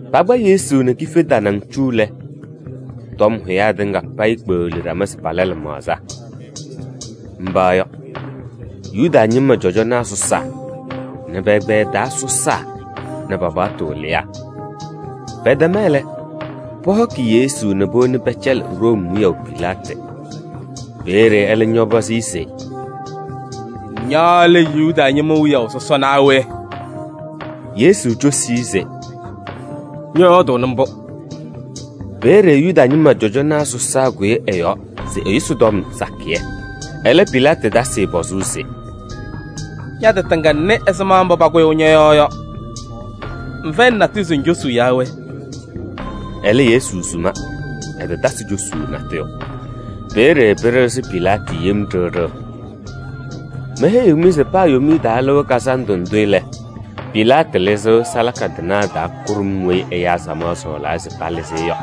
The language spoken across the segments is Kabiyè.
Pakpa Yesu nɛ kife tanaŋ cu lɛ, tɔm hʋyaa tɩŋa payɩ kpeɣli ɖama se pala lɩmaɣza. Mba yɔ: Yuda ñɩma cɔjɔnaa sɔsaa nɛ pɛ-ɛgbɛyɛ taa sɔsaa nɛ pa-paɣtʋ wɩlɩyaa. Pɛtɛma lɛ, pɔhɔkɩ Yesu nɛ powoni pɛcɛlɩ Room wiyaʋ Pilaatɩ. Peeye ɛlɛ ñɔpɔzɩ-ɩ se: “Ña lɛ Yuda ñɩma wiyaʋ sɔsɔ naa we?” Yesu cosi-i se: “Ñɔyɔɔdʋʋnɩ mbʋ.” Peeye Yuda ñɩma cɔjɔnaa sɔsaa kʋyɩ ɛ-yɔɔ se ɛyʋsɩ tɔm sakɩyɛ. Ɛlɛ Pilaatɩ tasɩ-ɩ pɔzʋʋ se: “Ña-tɩ tɩŋa ŋnɩ ɛzɩma mbʋ pakʋyʋʋ ñɔ-yɔɔ yɔ. Ŋfɛyɩnɩ natʋyʋ se ŋcosuu yaa we?” Ɛlɛ Yesu suma, ɛtatasɩ cosuu natʋyʋ. Peeye pɩɖɩɣzɩ Pilaatɩ yem ɖiɣ ɖiɣ. Meheyiɣ-mɩ se paa Yomiye Taa Lɩʋ Kazandʋ ndʋ lɛ, Pilaatɩ lɩzɩɣ salaka tɩnaa taa kʋɖʋm weyi ɛyaa samaɣ sɔɔlaa se palɩzɩ-ɩ yɔ.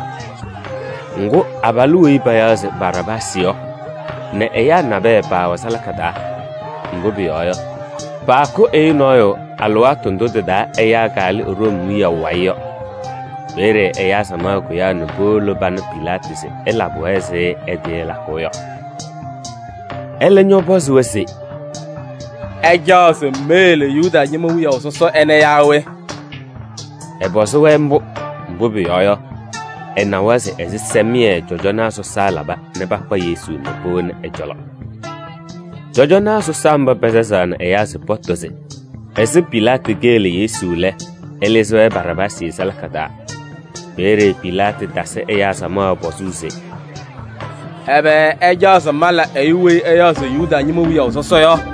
Ŋgʋ, abalʋ weyi payaɣ se Baraabaasɩ yɔ nɛ ɛyaa nabɛyɛ paawɛ salaka taa. Mbʋ pʋyɔɔ yɔ, paakʋ ɛyʋ nɔɔyʋ alɩwaatʋ ndʋ tɩ-taa ɛyaa kalɩ Room wiyaʋ wayɩ yɔ. Peeye ɛyaa samaɣ kʋyaa nɛ powolo pana Pilaatɩ se ɛlabɩ-wɛ ɛzɩ ɛtɩɩlakʋʋ yɔ. Ɛlɛ ñɔpɔzɩ-wɛ se: “Ɩcaɣ se meyele Yuda ñɩma wiyaʋ sɔsɔ ɛnɛ yaa we?” Ɛpɔzɩ-wɛ mbʋ, mbʋ pʋyɔɔ yɔ, ɛnawa se ɛzɩsɛmɩyɛ cɔjɔnaa sɔsaa laba nɛ pakpa Yesu nɛ powoni-i ɛ-cɔlɔ. Cɔjɔnaa sɔsaa mba pasazaɣnɩ ɛyaa se pɔtɔ se ɛzɩ Pilaatɩ keyele Yesu lɛ, ɛlɩzɩ-wɛ Baraabaasɩ salaka taa. Peeye Pilaatɩ tasɩ ɛyaa samaɣ pɔzʋʋ se: “Ɛbɛ ɩcaɣ se mala ɛyʋ weyi ɩyaɣ se Yuda ñɩma wiyaʋ sɔsɔ yɔ?”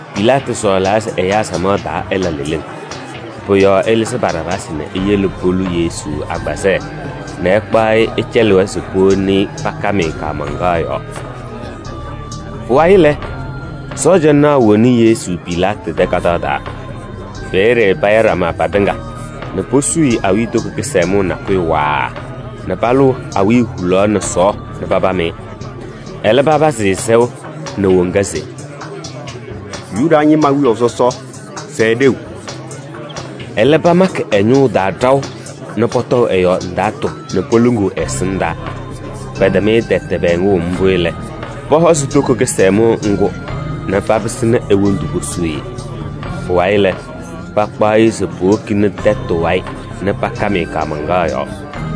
Pilaatɩ sɔɔlaa se ɛyaa samaɣ taa ɛla leleŋ. Pʋ-yɔɔ ɛlɩzɩ Baraabaasɩ nɛ eyele polu Yesu agbazɛɛ nɛ ɛkpaɣ-ɩ ɛcɛlɩ-wɛ se powoni-i pakam-ɩ kaamaŋkaɣ yɔɔ. Pʋwayɩ lɛ, sɔɔjanaa woni Yesu Pilaatɩ tɛ kadaɣ taa. Peeye paya ɖama patɩŋa nɛ posuu-i awiitoko kɩsɛmʋʋ nakʋyʋ waaa nɛ palʋʋ awiya hulaɣ nɛ sɔɔɔ nɛ papam-ɩ. Ɛlɛ, papazɩ-ɩ sɛʋ nɛ woŋa se: “Yuda ñɩma wiyaʋ sɔsɔ! Sɛɛ ɖeu!” Ɛlɛ pamakɩ ɛ-ñʋʋ taa ɖaʋ nɛ pɔtɔʋ ɛ-yɔɔ ndaatʋ nɛ poluŋuu ɛ-ɛsɩndaa. Pɛtɛm-ɩ tɛtɛ pɛɛŋʋʋ mbʋ lɛ, pɔhɔzɩ toko kɩsɛmʋʋ ŋgʋ nɛ papɩsɩnɩ e-wondu posuu-i. Pʋwayɩ lɛ, pakpaɣ-ɩ se powokini tɛtʋ wayɩ nɛ pakam-ɩ kaamaŋkaɣ yɔɔ.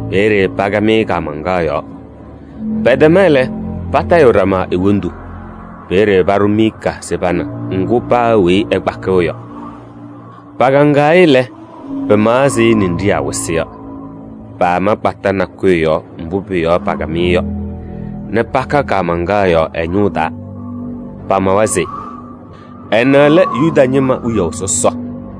Peeye pakam-ɩ kaamaŋkaɣ yɔɔ. Pɛtɛma lɛ, patayɩɣ ɖama e-wondu. Peeye paɖʋ miika se pana ŋgʋ paa weyi ɛkpakɩɣ yɔ. Pakaŋaɣ-ɩ lɛ, pɩmaɣ ɛzɩ ninɖiɣyaa wɩsɩ yɔ. Paama kpata nakʋyʋ yɔɔ mbʋ pʋ-yɔɔ pakam-ɩ yɔ nɛ paka kaamaŋkaɣ yɔɔ ɛ-ñʋʋ taa. Pamawa se: “Ɛnɛ lɛ Yuda ñɩma wiyaʋ sɔsɔ.”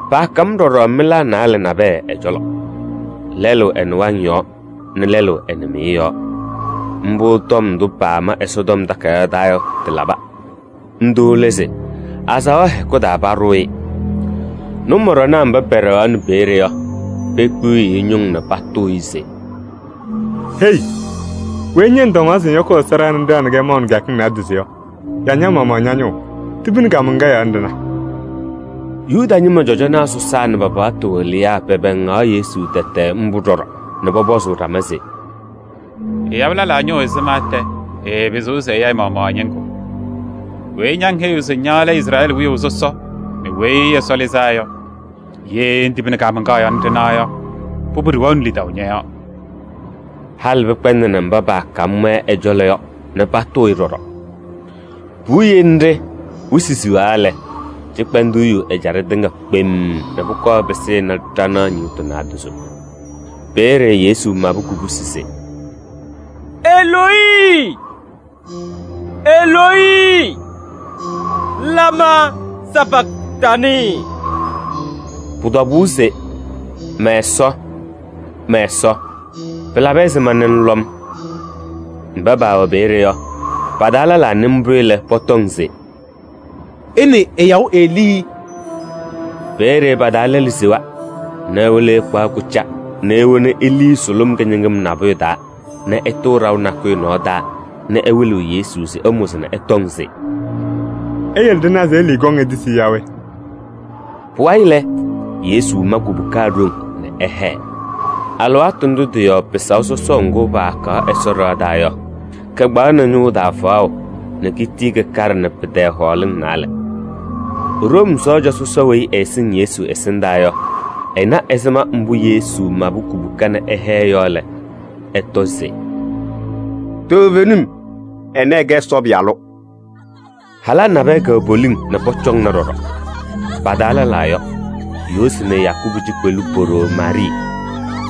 Paakam ɖɔɖɔ mɩlaa naalɛ nabɛyɛ ɛ-cɔlɔ: lɛlʋ ɛ-nɩwaŋ yɔɔ nɛ lɛlʋ ɛ-nɩmɩyɛ yɔɔ. [ Mbʋ tɔm ndʋ paama Ɛsɔtɔm Takayaɣ taa yɔ, tɩlaba. Ndʋ lɛ se: “Azaɣa hɛkʋ taa paɖʋʋ-ɩ.”] Nʋmɔɖɔnaa mba pɛɖɛɣaɣnɩ peeye yɔ, pekpiɣyiɣ-i ñʋŋ nɛ patʋʋ-ɩ se: “Hei! Weyi ña ŋtɔŋaɣ se ŋyɔkʋʋ Ɛsɔ ɖɩɣa nɛ ŋɖaɣnɩ-kɛ maʋ nɛ kɩyakɩŋ naadozo yɔ, ya ña-maɣmaɣ ña-ñʋʋ! Tibini kaamaŋkaɣ yɔɔ nɛ ɖɩna.” Yuda ñɩma cɔjɔnaa sɔsaa nɛ pa-paɣtʋ wɩlɩyaa pɛpɛɛŋaɣ Yesu tɛtɛ mbʋ ɖɔɖɔ nɛ pɔpɔzʋʋ ɖama se: “Ɛyabɩ lɛlaa ñʋʋ ɛzɩma tɛ ɛɛpɩzɩɣ se ɛya ɛ-maɣmaɣ ɛ-ñɩŋgʋ! Weyi ña ŋheyiɣ se ña lɛ Izrɛɛlɩ wiyaʋ sɔsɔ nɛ Weyi Ɛsɔ Lɩzaa Yɔ, ye ŋtibini kaamaŋkaɣ yɔɔ nɛ ɖɩna yɔ, pʋbʋ ɖɩwɛɣnɩ lidaʋ ñɔ-yɔɔ.” Halɩ pɩkpɛndɩnɩ mba paakam-wɛ ɛ-cɔlɔ yɔ nɛ patʋʋ-ɩ ɖɔɖɔ. Puwiye nɖɩ wɩsɩ siɣa lɛ, cɩkpɛndʋʋ yu ɛjaɖɛ tɩŋa kpemm nɛ pʋkɔɔ pɩsɩnɩ ɖanaɣ ñɩɣtʋ naadozo. Peeye Yesu mabɩ kubusi se: “Eloyi, Eloyi! Lamaa sapaktanɩɩ?” Pʋ-tɔbʋʋ se: “Mɛ-Ɛsɔ, mɛ-Ɛsɔ! Pɩlabɩ ɛzɩma nɛ ŋlɔ-m?” Mba paawɛ peeye yɔ, pa-taa lɛlaa nɩ mbʋ lɛ, pɔtɔŋ se: “Ɩnɩɩ ɛyaɣʋ Elii!” Peeye pa-taa lɛlʋ sewa nɛ ewolo ɛkpaɣ kʋca nɛ ewoni elii sʋlʋm kɩñɩŋɩm nabʋyʋ taa nɛ ɛtʋʋ ɖaʋ nakʋyʋ nɔɔ taa nɛ ɛwɩlɩɣ Yesu se ɛmʋzɩ nɛ ɛtɔŋ se: “Iyele ɖɩna se Elii kɔŋ etisi-i yaa we?” Pʋwayɩ lɛ, Yesu ma kubuka ɖoŋ nɛ ɛhɛɛ. Alɩwaatʋ ndʋ tɩ-yɔɔ pɩsaʋ sɔsɔʋ ŋgʋ paakaɣ Ɛsɔ ɖɩɣa taa yɔ, kɩkpaɣnɩ ñʋʋ taa faɣʋ nɛ kitii kɩkaɖɩnɩ pɩ-tɛɛ hɔɔlɩŋ naalɛ. Room sɔɔja sɔsɔ weyi ɛɛsɩŋ Yesu ɛsɩndaa yɔ, ɛna ɛzɩma mbʋ Yesu mabɩ kubuka nɛ ɛhɛɛ yɔ lɛ, ɛtɔ se: “Toovenim, ɛnɛ ɛɛkɛ Ɛsɔ Pɩyalʋ!” Halaa nabɛyɛ kɛwɛ poliŋ nɛ pɔcɔŋna ɖɔɖɔ. Pa-taa lɛlaa yɔ: Yoosi nɛ Yakubu cikpelu po-ɖoo Maarɩɩ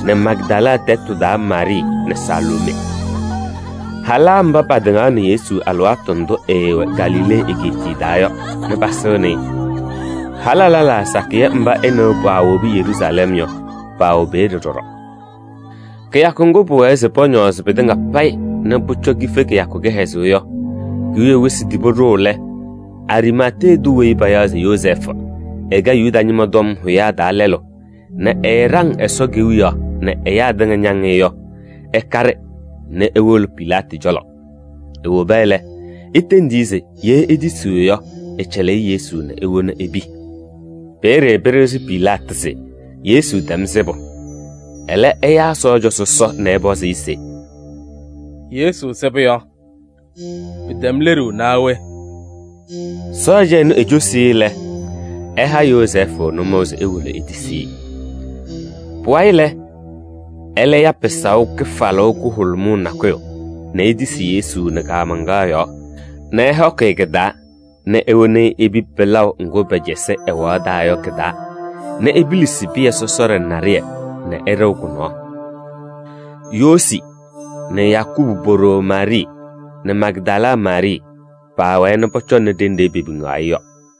nɛ Magdala tɛtʋ taa Maarɩɩ nɛ Saloomee. Halaa mba patɩŋaɣnɩ Yesu alɩwaatʋ ndʋ ɛɛwɛ Galilee egeetiye taa yɔ nɛ pasɩŋnɩ-ɩ. Halaa lɛlaa sakɩyɛ mba ɛ nɛ wɛ paawobi Yeruusalɛm yɔ, paawɛ peeye ɖɔɖɔ. Kɩyakʋ ŋgʋ pʋwɛɛ se pɔñɔɔzɩ pɩtɩŋa payɩ nɛ pʋcɔ kife kɩyakʋ kɩhɛzʋʋ yɔ ki-wiye wɩsɩ tibi ɖʋʋ lɛ, Ariimatee tʋ weyi payaɣ se Yozɛɛfʋ, ɛkɛ Yuda ñɩma tɔm hʋyaa taa lɛlʋ nɛ ɛɛɖaŋ Ɛsɔ Kewiyaɣ nɛ ɛyaa tɩŋa ñaŋ-ɩ yɔ, ɛkaɖɩ nɛ ewolo Pilaatɩ cɔlɔ. Ewoba lɛ, etendi-i se ye etisiɣ yɔ, ɛcɛlɩ-ɩ Yesu nɛ ewona epi. Peeye pɩɖɩɣzɩ Pilaatɩ se Yesu tɛm sɩbʋ, ɛlɛ ɛyaa sɔɔja sɔsɔ nɛ ɛpɔzɩ-ɩ se: “Yesu sɩbʋ yɔ, pɩtɛm leɖuu naa we?” Sɔɔja ɛnʋ ecosi-i lɛ, ɛha Yozɛɛfʋ nʋmɔʋ se ewolo etisi-i. Pʋwayɩ lɛ, ɛlɛ ya pɩsaʋ kɩfalʋʋ kʋhʋlʋmʋʋ nakʋyʋ nɛ etisi Yesu nɛ kaamaŋkaɣ yɔɔ nɛ ɛhɔkɩ-ɩ kɩ-taa nɛ ewoni-i epi pɩlaʋ ŋgʋ pɛcɛsɩ ɛwaɣ taa yɔ kɩ-taa nɛ epilisi pɩyɛ sɔsɔɖɛ naɖɩyɛ nɛ ɛɖɩɣ kʋ-nɔɔ. Yoosi nɛ Yakubu po-ɖoo Maarɩɩ nɛ Magdala Maarɩɩ paawɛɛ nɛ pɔcɔŋnɩ ɖenɖe pepiŋaɣ-ɩ yɔ.